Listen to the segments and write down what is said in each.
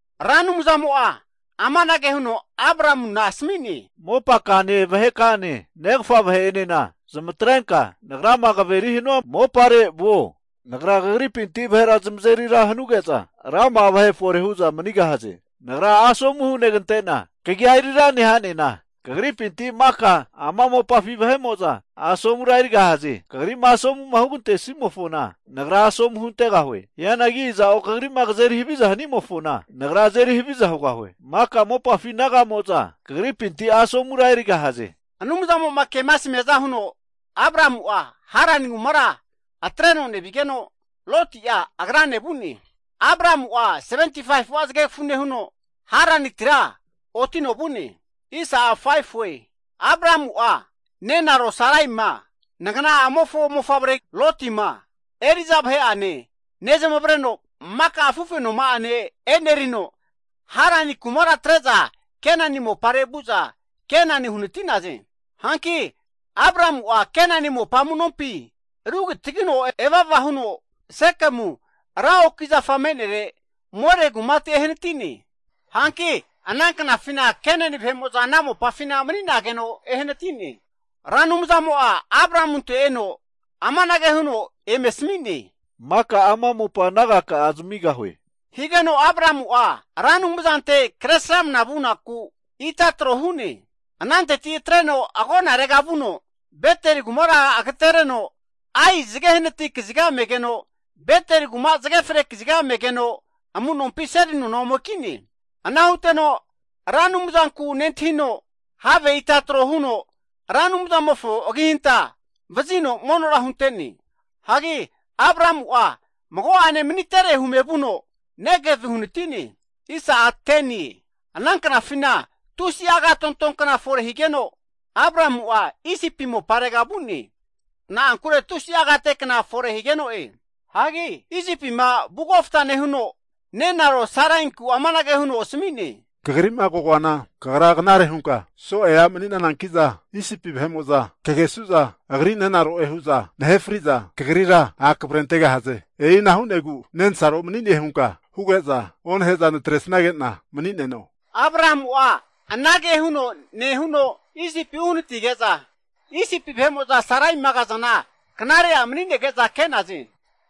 Ra Anumzamo'a amanage huno Abramuna asami'ne, Mopakane, vaheka'ane negafa vahe'enena zamatrenka Nagrama kaveri hanua mopare vuo. Nagra kagripinti vahera zamazeri ra hanuge'za, rama'a vahe fore hu'za manigahaze. Nagra asomu hunegante'na, kagi'a eri ra neha'nena, kagripinti maka ama mopafi vahe'mo'za asomura erigahaze. Kagri'ma asomu hugantesimofona Nagra asomu huntegahue. Hianagi aza'o kagri'ma kazeri haviza hanimofona, Nagra azeri haviza hugahue. Maka mopafi naga'mo'za kagripinti asomura erigahaze. Anumzamo'ma kema asmiaza huno Abramu'a Harani kumara atreno nevigeno, Loti'a agrane vu'ne. Abramu'a 75'a zagegafu nehuno Haranitira otino vu'ne. Abramu'a nenaro Saraima, nagana'amofo mofavre Loti'ma, eri'za vahe'ane, nezmavreno maka afufenoma'ane e'nerino Harani kumara atre'za Kenani mopare vu'za, Kenani uhanati'naze. Hanki Abramu'a Kenani mopa amu'nompi rugitagino eva eva huno Sekemu ra oki zafa me'nere More kumate ehanati'ne. Hanki ana knafina Kenani vahe'mo'za ana mopafina mani'nageno ehanati'ne. Ra Anumzamo'a Abramunte eno amanage huno eme asmi'ne, Maka ama mopa nagaka'a zamigahue, higeno Abramu'a Ra Anumzante Kresramana vunaku ita trohu'ne. Ananteti atreno agonarega vuno Betel kumara agatereno, Ai zage hanati kaziga megeno, Betel kuma zage fre kaziga me'negeno amu'nompi seli nona ome ki'ne. Ana huteno Ra Anumzanku nentahino, have ita tro huno Ra Anumzamofo agihanta vazino monora hunte'ne. Hagi Abramu'a mago'ene manitere hume vuno Negevi uhanati'ne. Ana knafina tusi'a agatonto kna fore higeno Abramu'a Isipi moparega vu'ne, na'ankure tusi'a agate kna fore higeno'e. Hagi Isipima vu kofta nehuno nenaro Sarainkura amanage huno asami'ne. Kagri'ma kagoana kagra knare hunka soe a' mani'nananki'za, Isipi vahe'mo'za kagesu'za Agri nenaro'e hu'za nahe fri'za kagrira a' kavre antegahaze. E'ina hu'negu, nensaro mani'ne hunka huge'za onahe'za natre'sage'na mani'neno. Abramu'a anage huno nehuno Isipi uhanatige'za, Isipi vahe'mo'za Saraima kazana knare a' mani'nege'za ke'naze.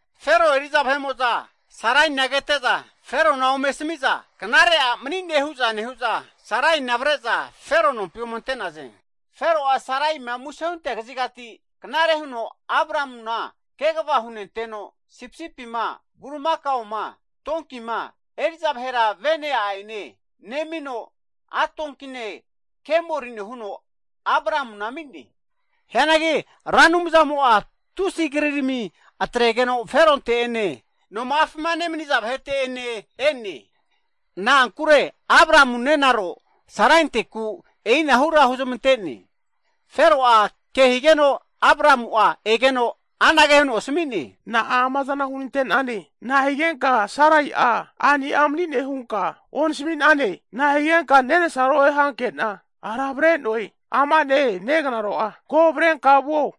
Fero eri'za vahe'mo'za Saraina kete'za Ferona ome asami'za, knare a' mani'ne hu'za nehu'za, Saraina avre'za Fero nompi ome ante'naze. Fero'a Saraima muse huntea kazigati, knare huno Abramuna kegava hunenteno, sipisipima, bulimakaoma, donkima, eri'za vahera vene a'ene nemino, a' donkine kemorine huno Abramuna ami'ne. Hianagi Ra Anumzamo'a tusi'a krirami atregeno Feronte ene, noma'afima nemaniza vahete'ene e'ne. Na'ankure Abramu nenaro Sarainteku e'inahura huzmante'ne. Fero'a ke higeno Abramu'a egeno anage huno asami'ne, Na'a ama zana hunante'nane? Nahigenka Sarai'a a'ni'a mani'ne hunka onasmi'nane? Nahigenka nensaro'e hankena ara avre'noe? Ama'ne negnaro'a! Ko avrenka vuo.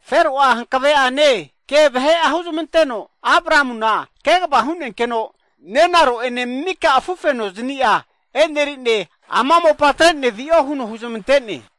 Fero'a hankave'ane ke vahe'a huzmanteno, Abramuna kegava hu'nenkeno nenaro'ene mika afu fenoznia enerine, ama mopa atrene vi'o huno huzmante'ne.